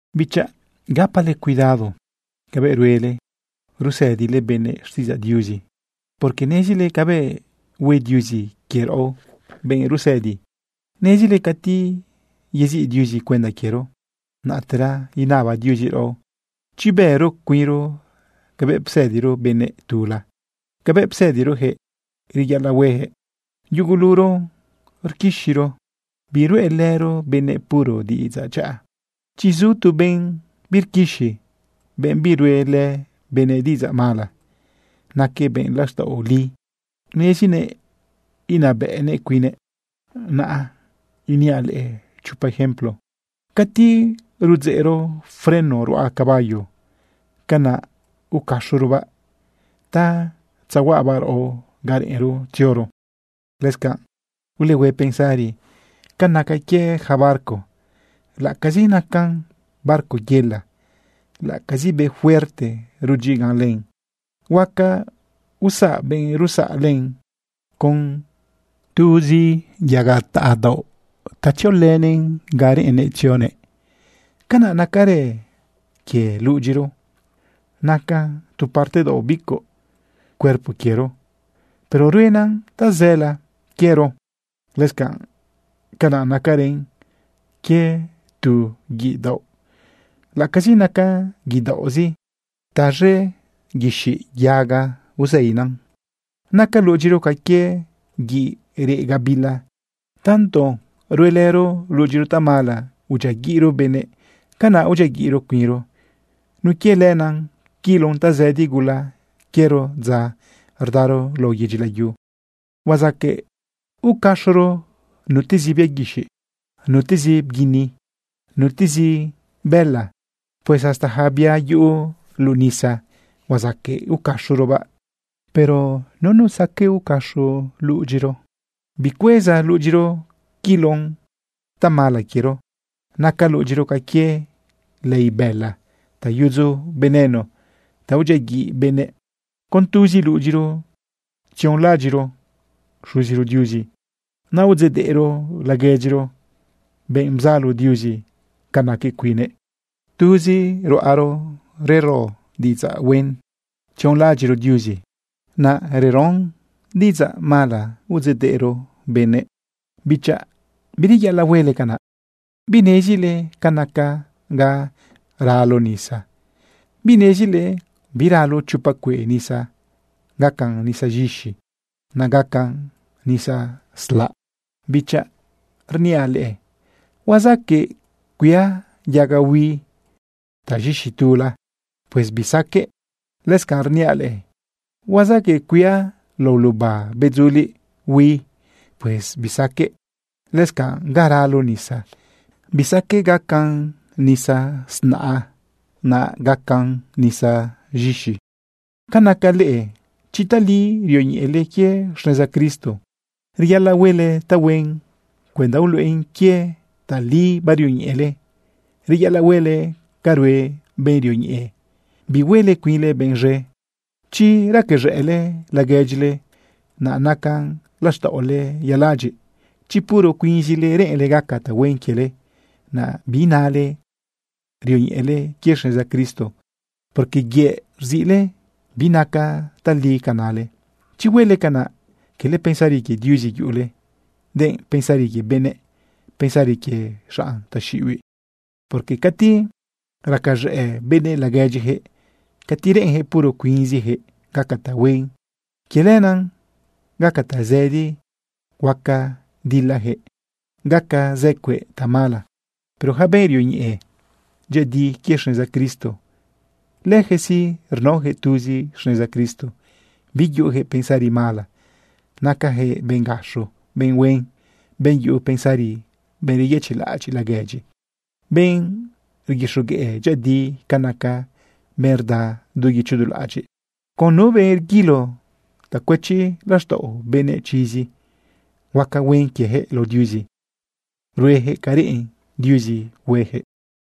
Bichaꞌ, gapale cuidado cabëꞌ ruele usëdile benëꞌ xtiꞌidzaꞌ Diuzi, porque nezile cabëꞌ hue Diuzi quie raꞌo benꞌ rusëdi. Nezile cati yeziꞌ Diuzi cuenda quiero, naꞌtera inaba Diuzi raꞌo chi bëro cuinro cabëꞌ psëdiro benëꞌ tula, cabëꞌ psëdirojëꞌ reyaꞌalaꞌ hueyaquëꞌ. Yuguluro rquixiro, biruꞌelëro benëꞌ puro diꞌidzaꞌ dyaꞌa. Chi zu tu benꞌ birquixi, benꞌ biruꞌelë benëꞌ diꞌidzaꞌ mala, naquëꞌ benꞌ laxtaꞌo li, nezinëꞌ inabëꞌnëꞌ cuinnëꞌ. Naꞌ iniaꞌ leꞌe chopa ejemplo. Cati rudzeꞌro freno ruꞌa caballo, canaꞌ ucaxorobaꞌ ta tzahuaꞌabaꞌ raꞌo ganꞌ reꞌenro tzioro. Lëscanꞌ ulehue pensari ca naca quie yaca barco. Laꞌacazi nacan barco yela, laꞌacazi be fuerte rudyigan len, huaca usaꞌ benꞌ rusaꞌ len con tuzi yaga taꞌa daoꞌ ta tziolënëꞌn ga reꞌennëꞌ tzioguëꞌ. Canaꞌ nacarë quie ludyiro. Nacan tu parte daoꞌ bicuꞌ cuerpo quiero, pero ruenan tazëla quiero. Lëscanꞌ canaꞌ nacarën quie tu guiꞌ daoꞌ. Laꞌacazi nacan guiꞌ daoꞌzi, taz̃e guixiꞌ yaga uzeinan. Naca ludyiro ca quie guiꞌ reꞌ gabila. Tanto ruelëro ludyiro tamala udyiaguiꞌro benëꞌ, canaꞌ udyiaguiꞌro cuinro. Nun quie lenaꞌ quilon tazëdi gula quiero dza rdaro lao yedyi layu. Huazaqueꞌ ucaxoro nutezi bia guixiꞌ, nutezi bguini, nutezi bëla. Pues hasta yaca bia yuꞌu luꞌu nisa huazaqueꞌ ucaxorobaꞌ. Pero nunu saqueꞌ ucaxo ludyinëꞌ. Bicueza ludyiro quilon tamala quiero. Naca ludyiro ca quie lei bëla ta yudzu veneno ta udyiaguiꞌ benëꞌ. Con tuzi ludyiro tzionlaꞌadyiꞌro Xuziro Diuzi, naꞌ udzeꞌdeꞌro laguedyiro, benꞌ bzalo Diuzi ca naquëꞌ cuinnëꞌ. Tuzi ruꞌaro rero diꞌidzaꞌ huen tzionlaꞌadyiꞌro Diuzi, naꞌ reron diꞌidzaꞌ mala udzeꞌdeꞌro benëꞌ. Bichaꞌ bireyaꞌalaꞌ huele canaꞌ. ¿Binezile ca naca ga ralo nisa? ¿Binezile biralo chopa cueꞌ nisa gacan nisa z̃ixi, naꞌ gacan nisa slaꞌ? Bichaꞌ, rniaꞌ leꞌe: ¿Huazaqueꞌ cuia yaga hui taz̃ixi tula? Pues bisaqueꞌ. Lëscanꞌ, rniaꞌ leꞌe: ¿Huazaqueꞌ cuia lao luba bedzuliꞌ hui? Pues bisaqueꞌ. Lëscanꞌ ga ralo nisa, bisaqueꞌ gacan nisa z̃naꞌa, naꞌ gacan nisa z̃ixi. Ca naca leꞌe, chi tali rioñeꞌele quie xneza Cristo, reyaꞌalaꞌ huele tahuen cuenda uluꞌen quie tali barioñeꞌele. Reyaꞌalaꞌ huele ca rue benꞌ rioñeꞌe, bihuele cuinle benꞌ z̃e. Chi racaz̃ëꞌle laguedyile, naꞌ naca laxtaꞌole yaladyiꞌ. Chi puro cuinzile reꞌenle gaca tahuen quiele, naꞌ biinale rioñeꞌele quie xneza Cristo, porque yëꞌ rziꞌle binaca tali ca nale. Chi huele canaꞌ, cala pensari quie Diuzi yuꞌule, denꞌ pensari quie benëꞌ, pensari quie xanꞌ taxiꞌibiꞌ. Porque cati racaz̃ëꞌ benëꞌ laguedyiyaquëꞌ, cati reꞌenyaquëꞌ puro cuinziyaquëꞌ gaca tahuen, quie lenaꞌ gaca tazëdi huaca dilayaquëꞌ, gaca zë cueꞌ tamala. Pero yaca benꞌ rioñeꞌe dyëꞌëdi quie xneza Cristo, lëjëꞌ sí, rnaoyaquëꞌ tuzi xneza Cristo, biyuꞌujëꞌ pensari mala. Nacayaquëꞌ benꞌ gaxo, benꞌ huen, benꞌ yuꞌu pensari, benꞌ reyëchiꞌlaꞌadyiꞌ laguedyi, benꞌ rguixogueꞌ dyëꞌëdi ca nacan, benꞌ rda du guicho du laꞌadyiꞌ. Con nu benꞌ rguilo ta cuëchi laxtaꞌo benëꞌ chizi, huaca huen quiejëꞌ lao Diuzi, ruejëꞌ ca reꞌen Diuzi huejëꞌ.